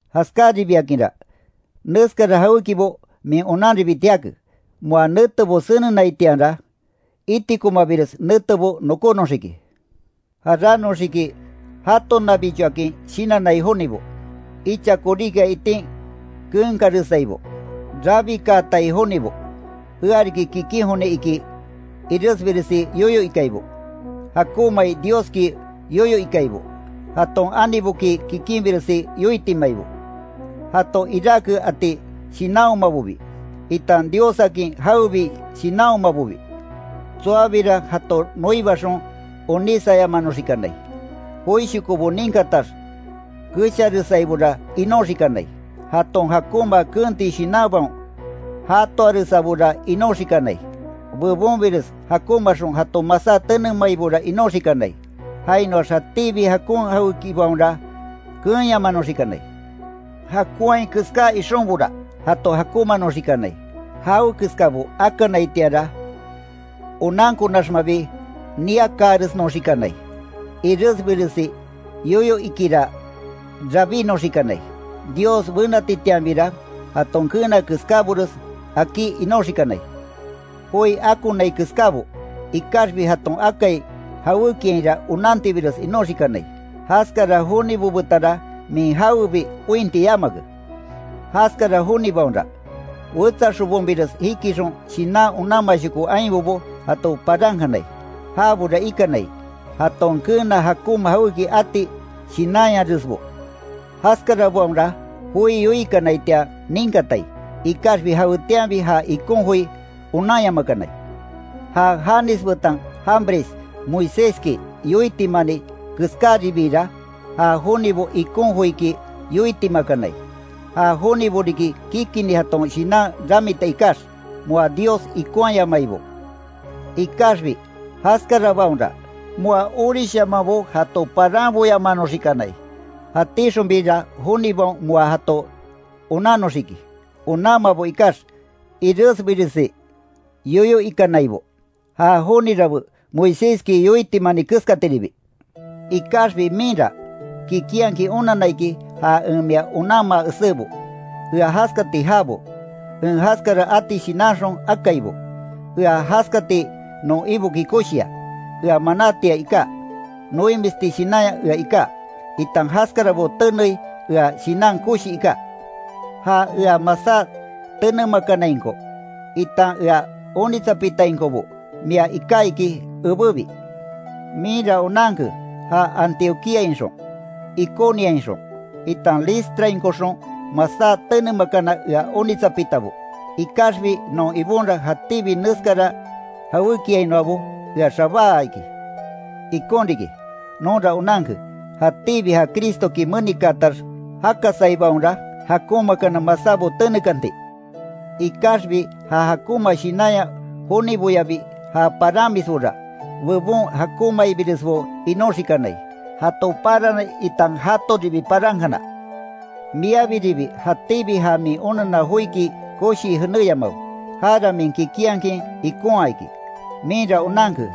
Jaskaribiakinra, neskara jawékibo min onanribiti jake, moa netebo senenaitianra, itikomabires netebo nokónoxiki. Jaránoxiki jatonabichoakin shinannai jonibo, icha koríkia itin keenkaresaibo, rabikaatai jonibo, ea riki kikin joni iki iresbiresi yoyo ikaibo, jakonmai Dioski yoyo ikaibo, jaton aniboki kikinbiresi yoitimaibo, jato iráke ati shinanhomabobi, itan Diossakin jawebi shinanhomabobi, tsoabira jato noibaxon onísayamanoxikanai, joishoko ninkatax kesharesaibora inoxikanai, jaton jakonma keenti shinanbaon jatoaresabora inoxikanai, bebonbires jakonmaaxon jato masá tenemaibora inoxikanai, jainoax jatíbi jakon jawékibaonra, keenyamanoxikanai, jakonhai keská ixonbora jato jakonmaanoxikanai, jawekeskabo akanaitianra onankonaxmabi niakaaresnoxikanai, iresbiresi yoyo ikira rabínoxikanai, Dios benatitianbira, jaton keena keskábares akí inoxikanai, joi akonai keskabo, ikaxbi jaton akai jawékiainra onantibires inoxikanai, jaskara jonibo betanra, min jawebi ointi yamake. Jaskara jonibaonra, wetsa xobonbires jikixon shinan onanmashoko ainbobo jato parankanai, jabora ikanai, jaton keena jakonma jawéki ati shinanyaresbo. Jaskarabaonra joi yoikanaitian ninkatai, ikaxbi jawetianbi ja ikon joi onanyamakanai. Ja Janes betan Jambres Moiséski yoitimani keskáribiira, ja jonibo ikon joiki yoitimakanai, ja jonibo riki kikinni jaton shinan ramita ikax, moa Dios ikonhayamaibo. Ikaxbi jaskarabaonra, moa orishamanbo jato paranboyamanoxikanai, jatíxonbira jonibaon moa jato onannoxiki onanmabo ikax, iresbiresi yoyo ikanaibo, ja joni rabé Moiséski yoitimani keskatiribi. Ikaxbi minra, kikinhakin onanna iki ja en mia onanmaa esébo. Ea jaskati jaabo, en jaskara ati shinanxon akaibo, ea jaskati non Iboki koshia, ea manátia iká, noimisti shinanya ea iká, itan jaskarabo tenei ea shinan koshi iká, ja ea masá tenemakanainko, itan ea onitsapitainkobo mia iká iki ebébi. Minra onanke ja Antioquíainxon, Iconioainxon, itan Listrainkoxon masá tenemakana ea onitsapitabo. Ikaxbi non Ibonra, jatíbi neskara jawékiainoabo ea xabáa iki. Ikon riki, nonra onanke, jatíbi ja Cristoki menikaatax jakasaibaonra, jakonmaakana masábo tenekanti, ikaxbi ja jakonma shinanya joniboyabi ja paranmisbora, bebon jakonmaibiresbo inoxikanai, jato parani itan jatoribi parankana. Miabiribi jatíbi ja min onanna joiki koshii jenéyamawe, jara min kikinhakin ikonhaa iki. Minra onanke,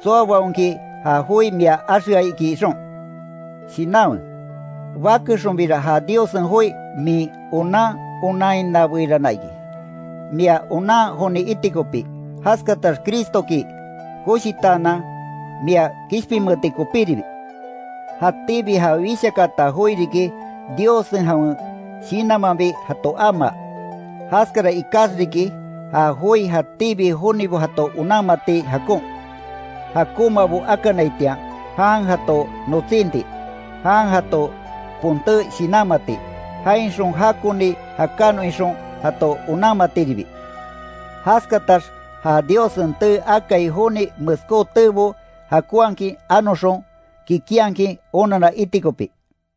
tsoabaonki ja joi mia axea iki ixon. Shinanwe, bakexonbira ja Diossen joi min onan onanhinabeirana iki, mia onan joni iti kopí, jaskatax Cristoki koshitaanan mia kishpinmeeti kopíribi. Jatíbi ja wishakaata joi riki, Diossen jawen shinanmanbi jato amaa. Jaskara ikax riki, ja joi jatíbi jonibo jato onanmati jakon, jakonmabo akanaitian jan jato notsinti, jan jato ponté shinanmati, jainxon jakoni jakanon ixon, jato onanmatiribi, jaskatax ja Diossen tee akai joni meskó teebo jakonhakin anoxon, kikinhakin onanna iti kopí.